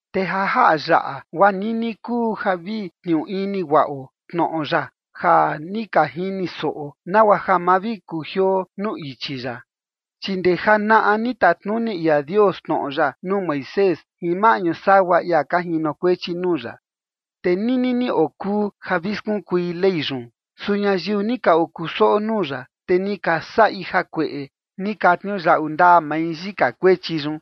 Te ja jaꞌa yaꞌa guaa nini kuu ja vi tniuu ini guaꞌo tnoꞌo ya ja ni ka jini soꞌo, nagua ja ma vi kujioo nuu ichi ya. Chi ndee janaꞌa ni tatnuni ia Dios tnoꞌo ya nuu Moisés jin maꞌñu sagua ia ka jinokuechi nuu ya, te nini ni okuu ja vi skunkui Ley yun. Su ñayiu ni ka okusoꞌo nuu ya, te ni ka saꞌi jakueꞌe, ni ka tniuyaꞌu ndaa mai yika kuechi yun.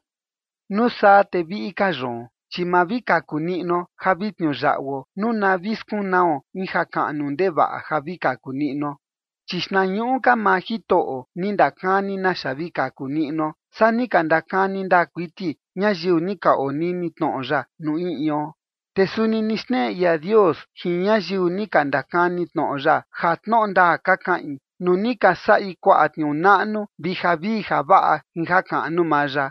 Nuu saa te viꞌi ka yoon, chi ma vi kaku niꞌnuo ja vi tniuyaꞌuo nuu na vi skunao in jakaꞌnu ndevaꞌa ja vi kaku niꞌnuo. Chi xtnañuꞌu ka maa Jitoꞌo ni ndakani naxa vi kaku niꞌnuo, saa ni ka ndakani ndaa kuiti ñayiu ni ka onini tnoꞌo ya nuu in ion. Te suni ni xneꞌe ia Dios jin ñayiu ni ka ndakani tnoꞌo ya ja tnoꞌo ndaa ka kaꞌin, nuu ni ka saꞌi kuaꞌa tniuu naꞌnu vi javii javaꞌa jin jakaꞌnu maa ya.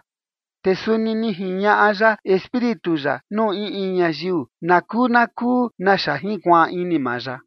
Te suni ni jiñaꞌa ya Espíritu ya nuu in in ñayiu nakuu nakuu naxa jinkuaan ini maa ya.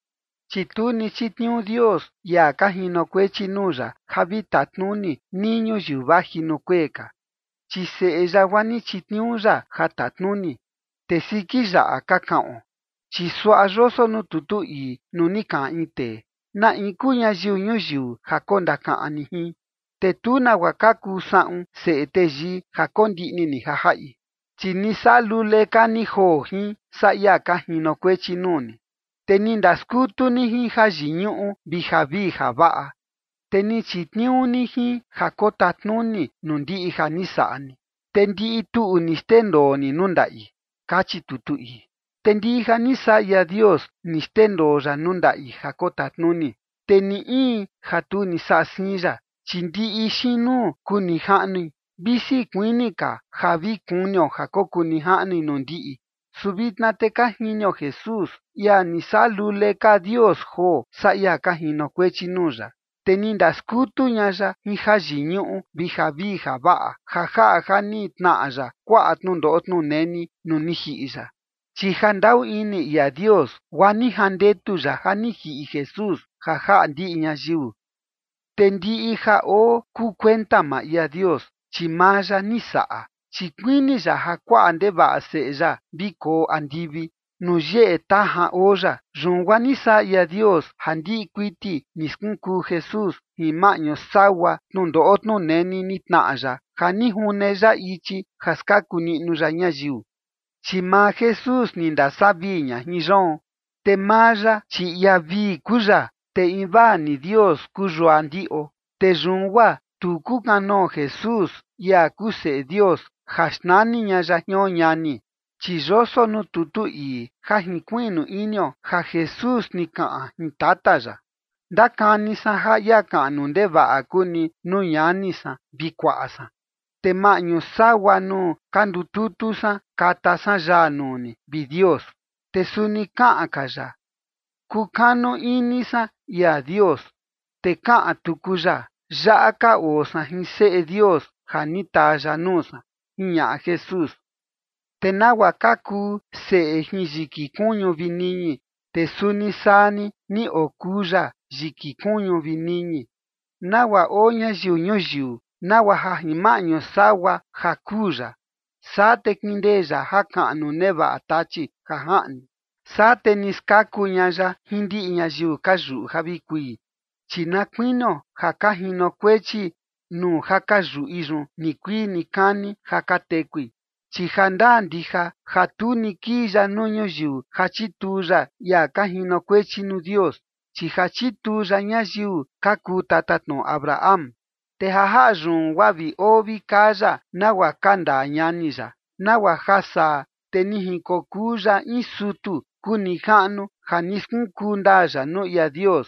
Chi tu ni chitniuu Dios ia ka jinokuechi nuu ya ja vi tatnuni nii ñuyiu vaji nuu kuee ka, chi Seꞌe ya guaa ni chitniuu ya ja tatnuni, te siki yaꞌa ka kaꞌon. Chi suaꞌa yoso nuu tutu ii, nuu ni kaꞌan in tee: ¿Na in kuu ñayiu ñuyiu ja kondakaꞌan ni jin? Te tu nagua ka kuu saꞌun seꞌe teyii ja kondiꞌni ni ja jaꞌi. Chi ni saꞌa lule ka ni joo jin, saa ia ka jinokuechi nuu ni, te ni ndaskutu ni jin jayiñuꞌu vi javii javaꞌa. Te ni chitniuu ni jin ja kotatnuni nuu ndiꞌi ja ni saꞌa ni, te ndiꞌi tuꞌu ni xndendoo ni nuu ndaꞌi, kachi tutu ii. Te ndiꞌi ja ni saꞌa ia Dios ni xndendoo ya nuu ndaꞌi ja kotatnuni, te ni in ja tu ni saꞌa siin ya, chi ndiꞌi xiin nuu kuu nijaꞌnui, visi kuini ka ja vi kunio ja kokuu nijaꞌnui nuu ndiꞌi. Su vitna te ka jinio Jesús, ia ni saꞌa lule ka Dios joo, saa ia ka jinokuechi nuu ya. Te ni ndaskutu ña ya jin jayiñuꞌu vi javii javaꞌa ja jaꞌa ja ni tnaꞌa ya kuaꞌa tnundoꞌo tnuneni nuu ni jiꞌi ya, chi jandaꞌu ini ia Dios, guaa ni jandetu ya ja ni jiꞌi Jesús ja jaꞌa ndiꞌi ñayiu. Te ndiꞌi ja oo kuu kuenta maa ia Dios, chi maa ya ni saꞌa, chi kuini ya ja kuaꞌa ndevaꞌa seꞌe ya vi koo andivi nuu yeꞌe tajan oo ya. Yun guaa ni saꞌa ia Dios ja ndiꞌi kuiti ni skunkuu Jesús jin maꞌñu sagua tnundoꞌo tnuneni ni tnaꞌa ya ja ni june ya ichi ja skaku niꞌnu ya ñayiu. Chi maa Jesús ni ndasavii ña jin yoon, te maa ya, chi ia vii kuu ya, te invaa ni Dios kuu yua ndiꞌo. Te yun guaa tu kukanoo Jesús, ia kuu Seꞌe Dios, ja xnani ña ya jion ñani. Chi yoso nuu tutu ii ja jinkuiꞌnu inio ja Jesús ni kaꞌan jin tata ya: Ndakani san ja ia kaꞌnu ndevaꞌa kuu ni nuu ñani san vi kuaꞌa san. Te maꞌñu sagua nuu ka ndututu san kata san yaa nuu ni, vi Dios. Te suni kaꞌan ka ya: Kukanu ini san ia Dios. Te kaꞌan tuku ya: Yaꞌa ka oo san jin seꞌe Dios ja ni taa ya nuu san, jiñaꞌa Jesús. Te nagua ka kuu seꞌe jin yiki kuñu vi niñi, te suni saa ni ni okuu ya yiki kuñu vi niñi, nagua oo ñayiu ñuyiu, nagua ja jin maꞌñu sagua ja kuu ya, saa te kindee ya jakaꞌnu nevaꞌa Tachi ja jaꞌni. Saa te ni skaku ña ya jin ndiꞌi ñayiu ka yuꞌu ja vi kui, chi na kuinio ja ka jinokuechi nuu ja ka yuꞌi yun nikuii nikani ja ka tekui. Chi jandaa ndija ja tu ni kii ya nuu ñuyiu ja chituu ya ia ka jinokuechi nuu Dios, chi ja chituu ya ñayiu ka kuu tatatnoꞌo Abraham. Te ja jaꞌa yun guaa vi oo vi kaa ya nagua ka ndaa ñani ya, nagua ja saa te ni jinkokuu ya in sutu kuu nijaꞌnu ja ni skunkuu ndaa ya nuu ia Dios.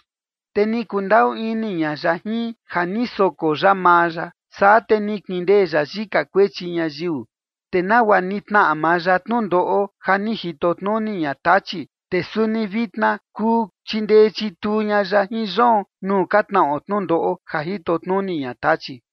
Te ni kundaꞌu ini ña ya jin, ja ni soko ya maa ya, saa te ni kindee ya yika kuechi ñayiu. Te nagua ni tnaꞌa maa ya tnundoꞌo ja ni jito tnuni ña Tachi, te suni vitna kuu chindee chituu ña ya jin yoon nuu ka tnaꞌo tnundoꞌo ja jito tnuni ña Tachi.